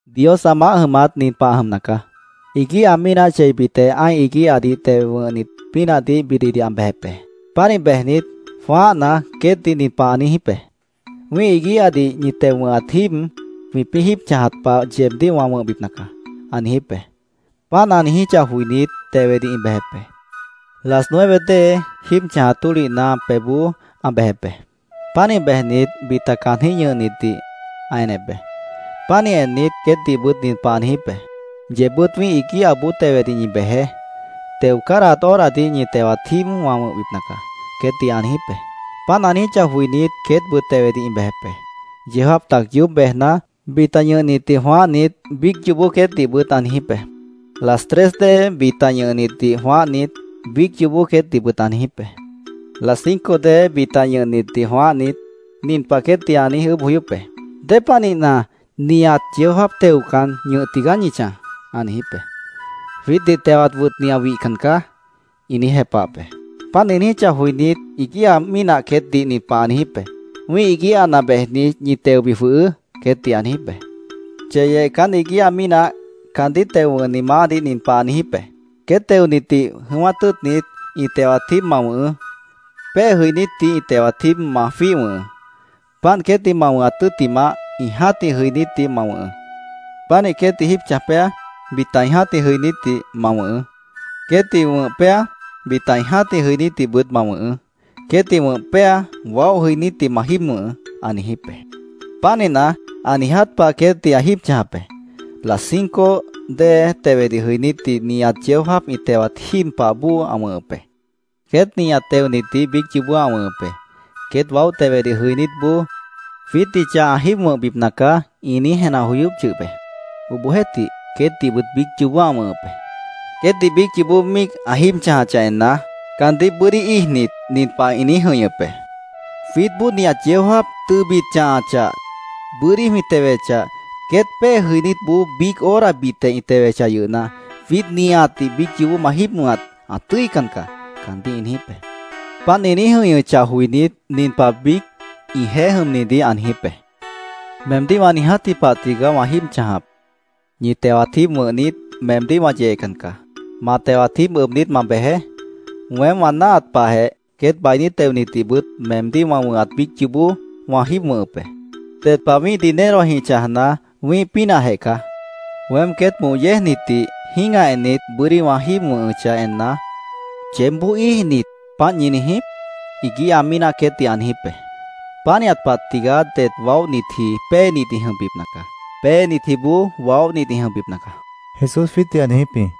“Dios ã maáh jʉmat nin pah ã jʉmna caá: Iguíha mínah cheibitjeh ã́ih iguíhadih teo wʉ̃hnit pínahdih bididih ã bejep be. Pánih bejnit, jwãáhna, queétdih nin pah ã niijíp be: ‘Wĩ́ih iguíhadih ñi teo wʉ̃hat jíib jwĩpĩ́ jíib chãjat pah yeebdíh wã wʉ̃hbipna caá’, ã niijíp be. Páant ã niijíchah joinít, tewedih ĩ bejep be. Las nueve dée, jíib chãjat tólihna pebhboó ã bejep be. Pánih bejnit, bita caanjĩ́h ñʉhnitdih ã enep be. Pánih ennit, queétdihbʉt nin pah ã niijíp be: ‘Yeebbʉ́t wĩ́ih iguíhaboó tewedih ñi bejeé. Teo cádahat horadih ñi tewat jíib wã wʉ̃hbipna caá’, queétdih ã niijíp be. Páant ã niijíchah joinít, queétbʉt tewedih ĩ bejep be. Yeó jáap tac yoób bejna, bita ñʉhnitdih jwãáhnit, biíc yoobó queétdihbʉt ã niijíp be. Las tres dée bita ñʉhnitdih jwãáhnit, biíc yoobó queétdihbʉt ã niijíp be. Las cinco dée bita ñʉhnitdih jwãáhnit, nin pah queétdih ã niíj ʉʉ́bh joyóp be: ‘¿Dépanihna nihat yeó jáap teocan, ñʉh tigaá ñi chãj?’ ã niijíp be. ‘Jwiítdih tewat wʉtni ã wihcan caá’, ĩ niíj jepahap be. Páant ĩ niijíchah joinít, iguíha mínah queétdih nin pah ã niijíp be: ‘Wĩ́ih iguíhana bejnit, ñi teobi jwʉhʉʉ́’, queétdih ã niijíp be. “Cheyeh caán iguíha mínah caandíh teo wʉ̃hni maáhdih nin pah ã niijíp be: ‘Queét teonitdih jʉ̃ʉ́wát tʉ́ʉtnit, ĩ tewat jíib ma wʉ̃hʉʉ́.Pée jʉinítdih ĩ tewat jíib ma jwíih wʉ̃hʉʉ́. Páant queétdih ma wʉ̃hat tʉ́ttimah, ĩ jã́tih jʉinítdih ma wʉ̃hʉʉ́. Pánih queétdih jíib chãj péa, bita ĩ jã́tih jʉinítdih ma wʉ̃hʉʉ́. Queétdih wʉ̃h péa, bita ĩ jã́tih jʉinítdihbʉt ma wʉ̃hʉʉ́. Queétdih wʉ̃h péa, waóh jʉinítdih ma jíib wʉ̃hʉʉ́’, ã niijíp be. Pánihna, ã niiját pah queétdih ã jíib chãjap be. Las cinco dée tewedih jʉinítdih nihat yeó jáap ĩ tewat jíib pah bóo ã wʉ̃hʉp be. Queét nihat teonitdih biíc yoobó ã wʉ̃hʉp be. Queét waóh tewedih jʉinítboó ‘Jwiítdih chah ã jíib wʉ̃hbipna caá’, ĩ niíj jenah joyóp yʉh be. Obohjeéhtih, queétdihbʉt biíc yoobó ã wʉ̃hʉp be. Queétdih biíc yoobó míic ã jíib chãjachah enna, caandíh bʉ́dí íijnit, nin pah ĩ niíj jʉ̃ihñʉp be: ‘Jwiítboó nihat yeó jáap, tʉbit ã chãhachah, bʉ́dí jwĩ tewechah, queét pée jʉinítboó biíc horabitjeh ĩ tewechah yʉhna, jwiít nihatdih biíc yoobó ma jíib wʉ̃hat, ã tʉ́ican caá’, caandíh ĩ niijíp be. Páant ĩ niíj jʉ̃ihñʉchah joinít, nin pah biíc ĩjeéh jʉmnidih ã niijíp be: ‘Meemdíh wã niijátji pah tigaá wã jíib chãjap. Ñi tewat jíib wʉ̃hnit, meemdíh wã yeecan caá. Ma tewat jíib ʉbnit, ma bejeé. Weém wã náahat pahjeh queét bainí teonitdihbʉt meemdíh wã wʉ̃hat biíc yoobó wã jíib wʉ̃hʉp be. Ded pah wĩ́ih dinerojĩh chãjna, wĩ́ih pínahjeh caá. Weém queét moh yéejnitdih jĩ́gah ennit, bʉ́dí wã jíib wʉ̃hʉchah enna, ¿yeébboó íij niít, páant ñi niijíp?’ iguíha mínah queétdih ã niijíp be. “Pánihat pah tigaá det waóhnitji péenit ĩ jʉmbipna caá. Péenitjiboó waóhnit ĩ jʉmbipna caá”, Jesús jwiítdih ã niijíp jĩ.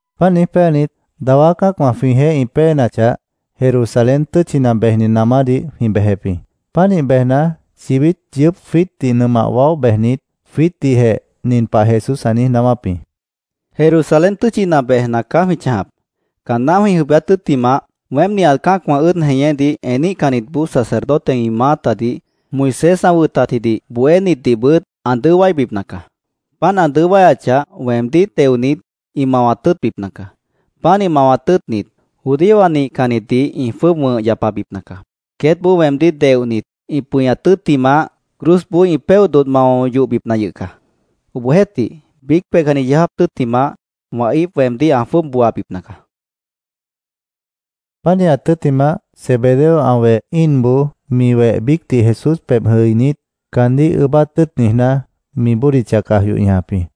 Páant niíj péanit, dawá cã́acwã jwĩjeéh ĩ péenachah, Jerusalén tʉ́tchina bejni namádih jwĩ bejep jĩ. Pánih bejna, chibít yʉʉ́p jwiítdih nʉmah waóh bejnit, jwiítdihjeh nin pah Jesús ã niíj naáwáp jĩ: —Jerusalén tʉ́tchina bejna caá jwĩ chãjap. Caanná jwĩ jʉibíát tʉ́ttimah, weém nihat cã́acwã ʉ́ʉd jeñédih eníhcanniboó sacerdotewã ĩ maátadih, Moisés ã wʉtatjidih bohénitdihbʉt ã dʉó wáibipna caá. Páant ã dʉó wáyachah, weemdíh teonit, ĩ mawat tʉ́ʉtbipna caá. Pánih mawat tʉ́ʉtnit, judíowã nihcannitdih ĩ jwʉ́ʉb wʉ̃h yapabipna caá. Queétboó weemdíh deohnit, ĩ pʉñat tʉ́ttimah, cruzboó ĩ péoh dodh mao yohbipna yʉh caá. Obohjeéhtih, biíc peihcanni yeó jáap tʉ́ttimah, wã íip weemdíh ã jwʉ́ʉb booabipna caá, ã niijíp jĩ. Pánihat tʉ́ttimah, Zebedeo ã weh íinboó mi weh biícdih Jesús pebh jʉinít, caandíh ʉʉ́bát tʉ́ʉt niijná, mi bódicha caj yoh ñajap jĩ.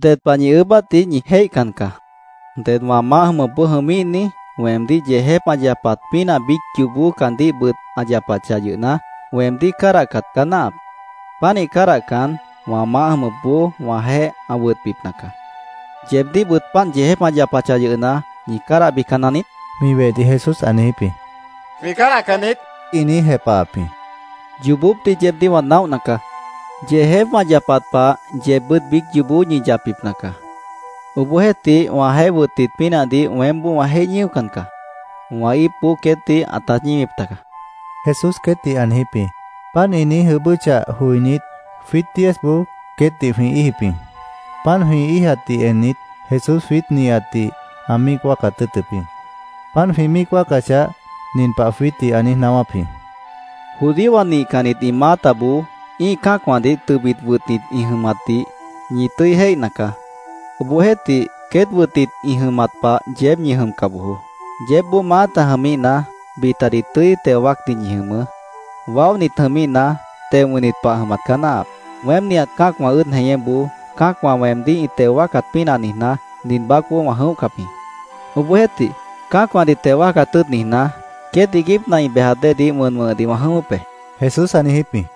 —Ded pah ñi ʉʉ́bátdih ñi jéihcan caá. Ded wã maáh jʉmʉpboó jʉmíhni, weemdíh yeejép ã yapat pínah, biíc yoobó caandíhbʉt ã yapachah yʉhna, weemdíh cádahcat caá náahap. Pánih cádahcan, wã maáh jʉmʉpboó wãjeéh ã wʉtbipna caá. ¿Yeebdíhbʉt páant yeejép ã yapachah yʉhna, ñi cádahbican naniít? mi wehdih Jesús ã niijíp jĩ. —Jwĩ cádahcan niít, ĩ niíj jepahap jĩ. —Yoobópdih yeebdíh wã naóhna caá. Yeejép wã yapat pah yeebbʉ́t biíc yoobó ñi yapbipna caá. Obohjeéhtih, wãjeéh wʉtnit pínahdih weémboó wã jéih ñíocan caá. Wã íipboó queétdih ãtát ñíwip taga, Jesús queétdih ã niijíp jĩ. Páant ĩ niíj ʉʉ́bʉ́chah joinít, jwiít diezboó queétdih jwĩ íijip jĩ. Páant jwĩ íijatdih ennit, Jesús jwiít nihatdih ã míic wáacat tʉ́ʉtʉp jĩ. Páant jwĩ míic wáacachah, nin pah jwiítdih ã niíj naáwáp jĩ: —Judíowã nihcannit ĩ maátaboó ĩ́ih cã́acwãdih tʉbit wʉtnit ĩ jʉmatdih ñi tʉ́i jéihna caá. Obohjeéhtih, queét wʉtnit ĩ jʉmat pah yeéb ñi jʉmca bojoó. Yeébboó maáta jʉmíhna, bitadih tʉ́i teo wáacnit ñi jʉmʉʉ́. Waóhnit jʉmíhna, teo wʉ̃hnit pah jʉmat caá náahap. Weém nihat cã́acwã ʉ́ʉd jeñéboó cã́acwã weemdíh ĩ teo wáacat pínah niijná, nin baácboó wã jʉ̃óhcap jĩ. Obohjeéhtih, cã́acwãdih teo wáacat tʉ́ʉt niijná, queét iiguípna ĩ bejat déedih wʉn wʉ̃hʉdih wã jʉ̃ʉ́wʉ́p be, Jesús ã niijíp jĩ.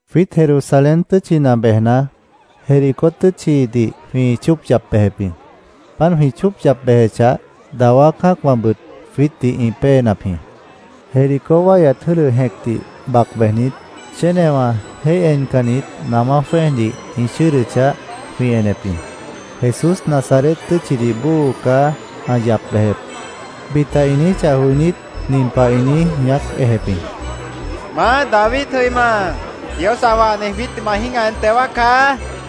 Jwiít Jerusalén tʉ́tchina bejna, Jericó tʉ́tchidih jwĩ chóop yap bejep jĩ. Páant jwĩ chóop yap bejechah, dawá cã́acwãbʉt jwiítdih ĩ péenap jĩ. Jericó wáihyat jʉ́dʉ jẽcdih bac bejnit, chénewã jéih encannit namá jwẽ́ejdih ĩ chʉ́ʉdʉchah, jwĩ enep jĩ. “Jesús, Nazaret tʉ́tchidih bóo caá ã yap bejep”, bita ĩ niijíchah joinít, nin pah ĩ niíj ñaác ejep jĩ: —¡Maá, David jʉima, Dios ã wahni jwiítdih ma jĩ́gah en teo wáacá! ĩ niijíp jĩ.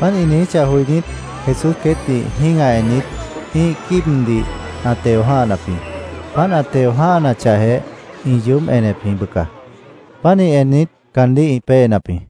Páant ĩ niijíchah joinít, Jesús queétdih jĩ́gah ennit, ĩ́ih quíibdih ã teo jã́hanap jĩ. Páant ã teo jã́hanachahjeh, ĩ yoób enep jĩ, bʉca. Pánih ennit, caandíh ĩ péenap jĩ.